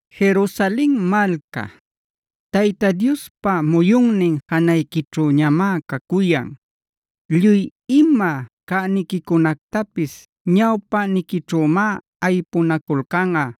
Jerusalen malca, Tayta Diospa muyunnin janayquićhüñamá cacuyan; lluy ima cäniquicunactapis ñawpäniquićhümá aypunaculcanꞌa.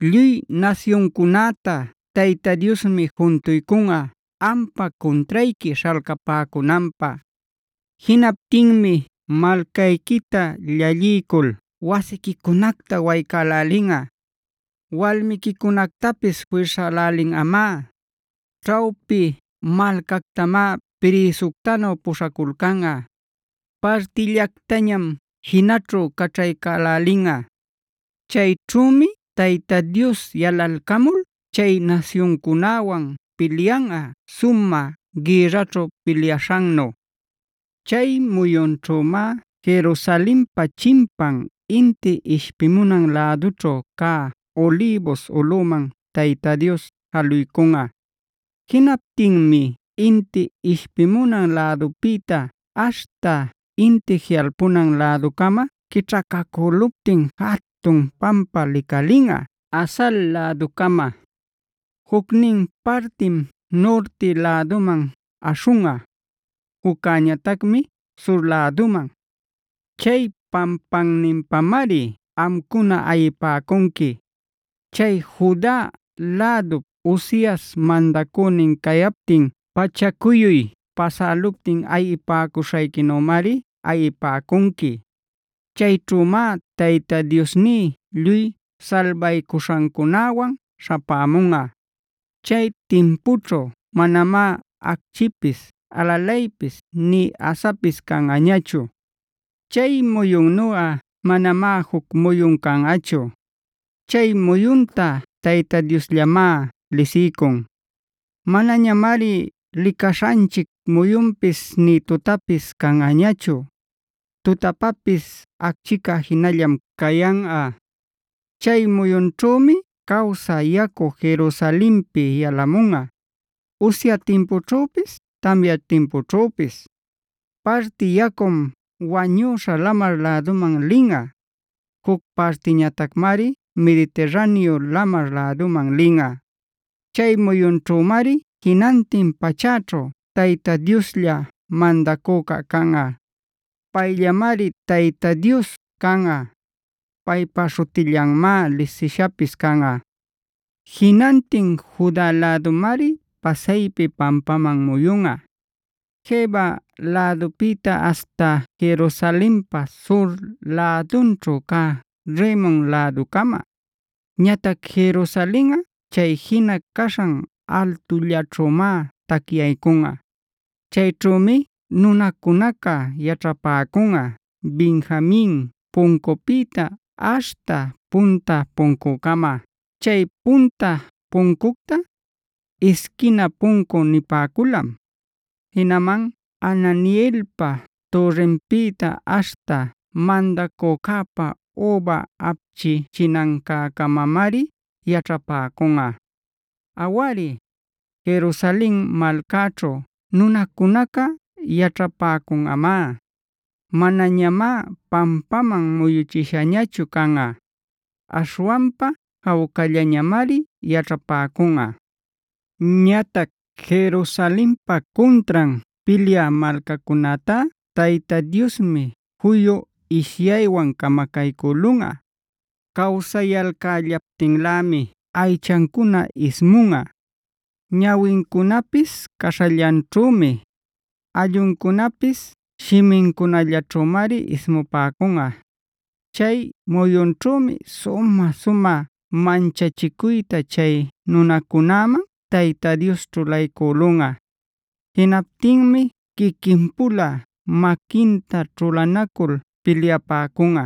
Lluy nasyuncunäta Tayta Diosmi juntuycunꞌa ampa cuntrayqui śhalcapäcunanpä. Jinaptinmi malcayquita llalliycul wasiquicunacta waycälälinꞌa; walmiquicunactapis firsälälinꞌamá. Ćhawpi malcactamá prïsuctanu puśhaculcanꞌa; partillactañam jinaćhu caćhaycälälinꞌa. Chayćhümi Tayta Dios yalalcamul chay nasyuncunäwan pilyanꞌa sumä gïrraćhu pilyaśhannu. Chay muyunćhümá Jerusalenpa chimpan inti ishpimunan lädućhu cä Olivos ulꞌuman Tayta Dios jaluycunꞌa. Jinaptinmi inti ishpimunan lädupïta aśhta inti jiꞌalpunan läducama quićhacacüluptin jatun pampa licalinꞌa Azal läducama; jucnin partim nurti läduman aśhunꞌa, juccäñatacmi sur läduman. Chay pampanninpamari amcuna ayipäcunqui. Chay Juda lädup Uzias mandacünin cayaptin pachacuyuy pasäluptin ayipäcuśhayquinümari ayipäcunqui. Chayćhümá Tayta Diosní lluy salbaycuśhancunäwan śhapämunꞌa. Chay timpućhu manamá acchipis, alalaypis, nï asapis canꞌañachu. Chay muyunnuꞌa manamá juc muyun canꞌachu; chay muyunta Tayta Diosllamá lisiycun. Manañamari licaśhanchic muyunpis nï tutapis canꞌañachu; tutapapis acchica jinallam cayanꞌa. Chay muyunćhümi cawsä yacu, Jerusalenpi yalamunꞌa, usya timpućhüpis, tamya timpućhüpis. Parti yacum Wañüśha Lamar läduman linꞌa; juc partiñatacmari Mediterraneo lamar läduman linꞌa. Chay muyunćhümari jinantin pachäćhu Tayta Dioslla mandacüca canꞌa. Payllamari Tayta Dios canꞌa, paypa śhutillanmá lisishapis canꞌa. Jinantin Juda lädumari pasaypi pampaman muyunꞌa, Geba lädupïta aśhta Jerusalenpa sur lädunćhu cä Rimon läducama. Ñatac Jerusalenꞌa chay jina caśhan altullaćhümá tacyaycunꞌa. Chayćhümi nunacunaca yaćhapäcunꞌa Benjamin Puncupïta aśhta Punta Puncucama. Chay Punta Puncucta, Isquina Puncu nipäculam. Jinaman Hananeelpa Türrinpïta aśhta mandacücäpa üba apchichinancäcamari yaćhapäcunꞌa. Awari, Jerusalen malcaćhu nunacunaca yaćhapäcunꞌamá. Manañamá pampaman muyuchishañachu canꞌa; aśhwanpa jawcallañamari yaćhapäcunꞌa. Ñatac Jerusalenpa cuntran pilyä malcacunätá Tayta Diosmi juyu ishyaywan camacaycülunꞌa. Cawsayalcällaptinlämi aychancuna ismunꞌa, ñawincunapis caśhallanćhümi, alluncunapis shimincunallaćhümari ismupäcunꞌa. Chay muyunćhümi sumä-sumä manchachicuyta chay nunacunäman Tayta Dios ćhulaycülunꞌa. Jinaptinmi quiquin-pula maquinta ćhulanacul pilyapäcunꞌa.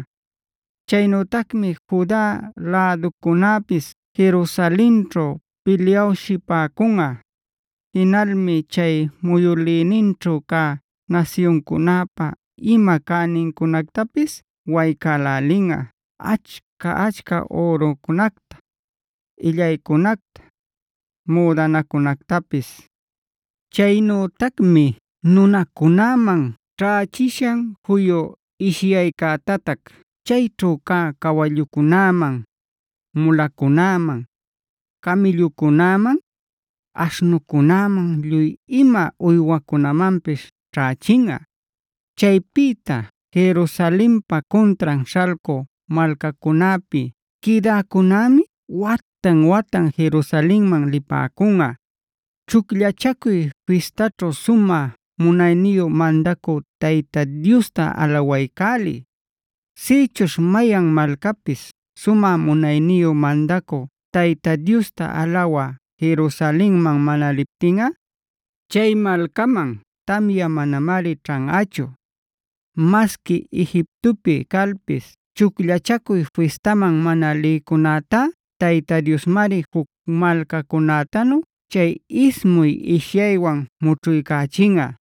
Chaynütacmi Juda läducunäpis Jerusalenćhu pilyawshipäcunꞌa. Jinalmi chay muyülïninćhu cä nasyuncunäpa ima cänincunactapis waycälälinꞌa: achca-achca ürucunacta, illaycunacta, müdanacunactapis. Chaynütacmi nunacunäman ćhächishan juyu ishyaycätatac chayćhu cä cawallucunäman, mulacunäman, camïllucunäman, aśhnucunäman, lluy ima uywacunämanpis ćhächinꞌa. Chaypïta Jerusalenpa cuntran śhalcü malcacunäpi quïdäcunämi watan-watan Jerusalenman lipäcunꞌa, Chucllachacuy Fistaćhu sumä munayniyu mandacü Tayta Diosta alawaycälï. Sïchuśh mayan malcapis sumä munayniyu mandacü Tayta Diosta alawä Jerusalenman mana liptinꞌa, chay malcaman tamya manamari ćhanꞌachu. Masqui Egiptopi calpis Chucllachacuy Fistaman mana lïcunätá Tayta Diosmari juc malcacunätanu chay ismuy ishyaywan mućhuycachinꞌa;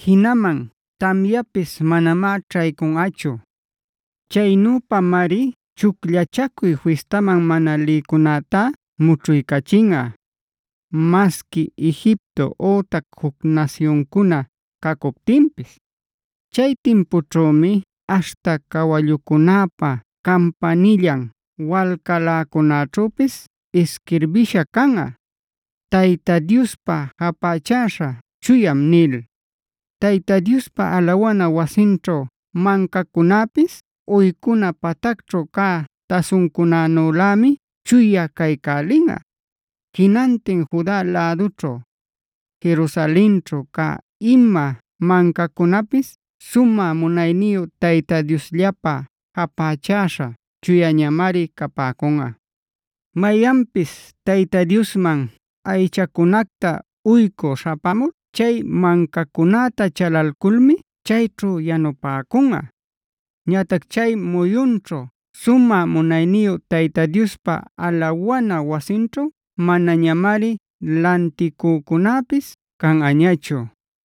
jinaman tamyapis manamá ćhaycunꞌachu. Chaynüpamari Chucllachacuy Fistaman mana lïcunätá mućhuycachinꞌa, masqui Egipto ütac juc nasyuncuna cacuptinpis. Chay timpućhümi aśhta cawallucunäpa campanillan walcaläcunäćhüpis isquirbïsha canꞌa: “Tayta Diospä japächäśha chuyam” nil. Tayta Diospa alawana wasinćhu mancacunäpis uycuna patacćhu cä tasuncunänülämi chuya caycälinꞌa. Jinantin Juda lädućhu, Jerusalenćhu cä ima mancacunapis sumä munayniyu Tayta Diosllapä japächäśha chuyañamari capäcunꞌa. Mayanpis Tayta Diosman aychacunacta uycü śhapämul chay mancacunäta chalalculmi chayćhu yanupäcunꞌa. Ñatac chay muyunćhu sumä munayniyu Tayta Diospa alawana wasinćhu manañamari lanticücunapis canꞌañachu.